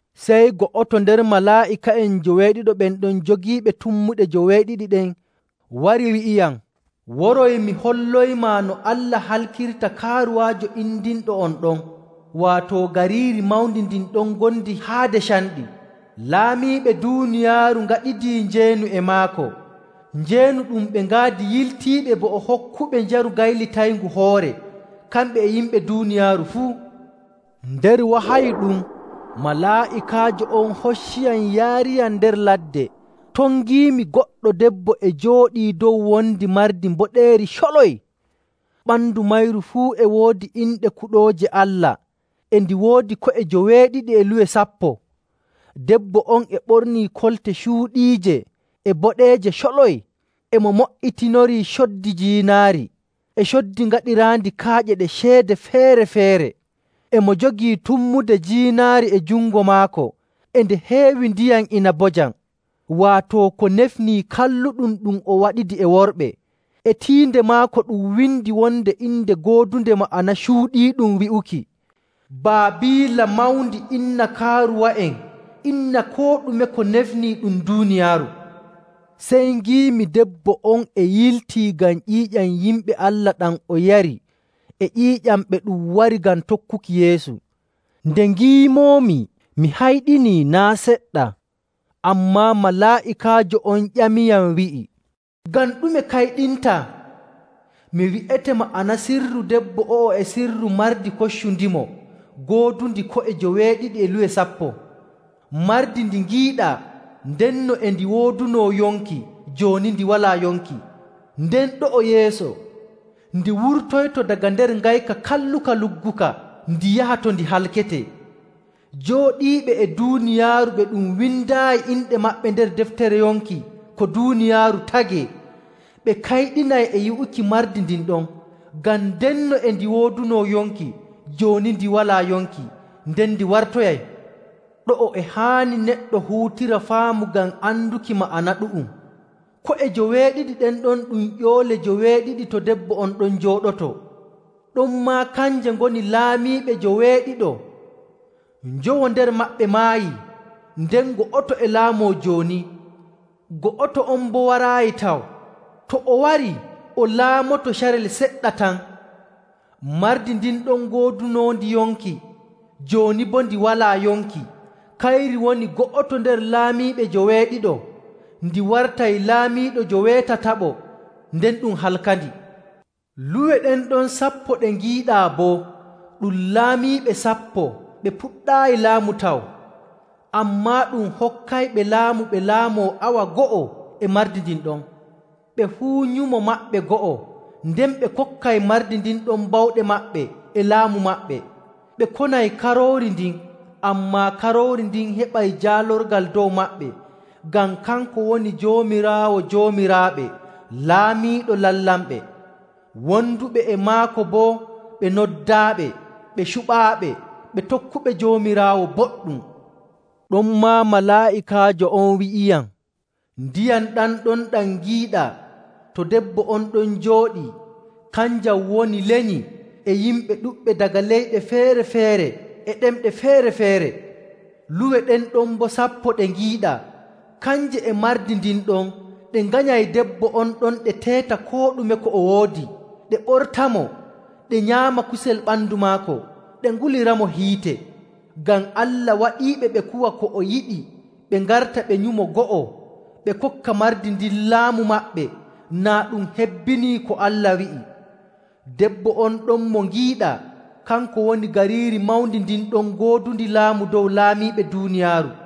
Sey go'oto nder malaa'ika'en njoweeɗiɗo ɓen ɗon jogiiɓe tummuɗe joweeɗiɗi ɗen wari wi'iyam, “Woroy mi holloymaa no Allah halkirta kaaruwaajo indinɗo, on ɗon waato gariiri mawndi ndin ɗon ngondi haade canɗi. Laamiiɓe duuniyaaru ngaɗidii njeenu e maako. Njeenu ɗum ɓe ngaadi yiltiiɓe bo o hokkuɓe njaru gaylitayngu hoore, kamɓe e yimɓe duuniyaaru fuu.” Nder wahayu ɗum, malaa'ikaajo on hocciyam yaariyam nder ladde ton ngiimi goɗɗo debbo e jooɗii dow wondi mardi mboɗeeri coloy. Ɓandu mayri fuu e woodi inɗe kuɗooje Allah e ndi woodi ko'e joweeɗiɗi e luwe sappo. Debbo on e ɓornii kolte cuuɗiije e boɗeeje coloy, e mo mo''itinorii coddi jiinaari, e coddi gaɗiraandi kaaƴe ɗe ceede feere‑feere. E mo jogii tummude jiinaari e jungo maako e nde heewi ndiyam inabojam, waato ko nefnii kalluɗum ɗum o waɗidi e worɓe. E tiinde maako ɗum windi wonde inde goodunde ma'ana cuuɗiiɗum, wi'uki, “Baabiila Mawndi inna kaaruwa'en inna koo ɗume ko nefnii ɗum duuniyaaru.” Sey ngiimi debbo on e yiltii ngam ƴiiƴam yimɓe Allah ɗam o yari e ƴiiƴam ɓe ɗum wari ngam tokkuki Yeesu. Nde ngiimoomi mi hayɗinii naa' seɗɗa. Ammaa malaa'ikaajo on ƴamiyam wi'i, “Ngam ɗume kayɗintaa? Mi wi'ete ma'ana sirru debbo o'o e sirru mardi koccundimo ngoodundi ko'e joweeɗiɗi e luwe sappo. Mardi ndi ngiiɗaa, ndenno e ndi woodunoo yonki, jooni ndi walaa yonki, nden ɗo'o yeeso ndi wurtoyto daga nder ngayka kalluka lugguka ndi yaha to ndi halketee. Jooɗiiɓe e duuniyaaru ɓe ɗum windaayi inɗe maɓɓe nder deftere yonki ko duuniyaaru tagee, ɓe kayɗinay e yi'uki mardi ndin ɗon. Ngam ndenno e ndi woodunoo yonki, jooni ndi walaa yonki, nden ndi wartoyay. “Ɗo'o e haani neɗɗo huutira faamu ngam anduki ma'ana ɗu'um. Ko'e joweeɗiɗi ɗen ɗon ɗum ƴoole joweeɗiɗi to debbo on ɗon jooɗotoo, ɗonmaa kanje ngoni laamiiɓe njoweeɗiɗo. Njowo nder maɓɓe maayi, nden go'oto e laamoo jooni, go'oto on boo waraayi taw. To o warii, o laamoto carel seɗɗa tan. Mardi ndin ɗon goodunoondi yonki, jooni boo ndi walaa yonki, kayri woni go'oto nder laamiiɓe njoweeɗiɗo, ndi wartay laamiiɗo njoweetataɓo, nden ɗum halkandi. “Luwe ɗen ɗon sappo ɗe ngiiɗaa boo ɗum laamiiɓe sappo ɓe puɗɗaayi laamu taw, ammaa ɗum hokkayɓe laamu ɓe laamoo awa go'o e mardi ndin ɗon. Ɓe fuu nyumo maɓɓe go'o, nden ɓe kokkay mardi ndin ɗon bawɗe maɓɓe e laamu maɓɓe. Ɓe konay Karoori ndin, ammaa Karoori ndin heɓa jaalorgal dow maɓɓe ngam kanko woni Joomiraawo joomiraaɓe, Laamiiɗo lamlamɓe. Wonduɓe e maako boo ɓe noddaaɓe, ɓe cuɓaaɓe, ɓe tokkuɓe Joomiraawo boɗɗum.” Ɗonmaa malaa'ikaajo on wi'iyam, “Ndiyam ɗam ɗon ɗam ngiiɗaa, to debbo on ɗon jooɗii. Kanjam woni lenyi, e yimɓe ɗuɗɓe daga leyɗe feere‑feere e ɗemɗe feere‑feere. Luwe ɗen ɗon boo sappo ɗe ngiiɗaa, kanje e mardi ndin ɗon ɗe nganyay debbo on ɗon ɗe teeta koo ɗume ko o woodi, ɗe ɓortamo, ɗe nyaama kusel ɓandu maako, ɗe nguliramo hiite. Ngam Allah waɗiiɓe ɓe kuwa ko o yiɗi ɓe ngarta ɓe nyumo go'o, ɓe kokka mardi ndin laamu maɓɓe, naa ɗum hebbinii ko Allah wi'i. “Debbo on ɗon mo ngiiɗaa, kanko woni gariiri mawndi ndin ɗon goodundi laamu dow laamiiɓe duuniyaaru.”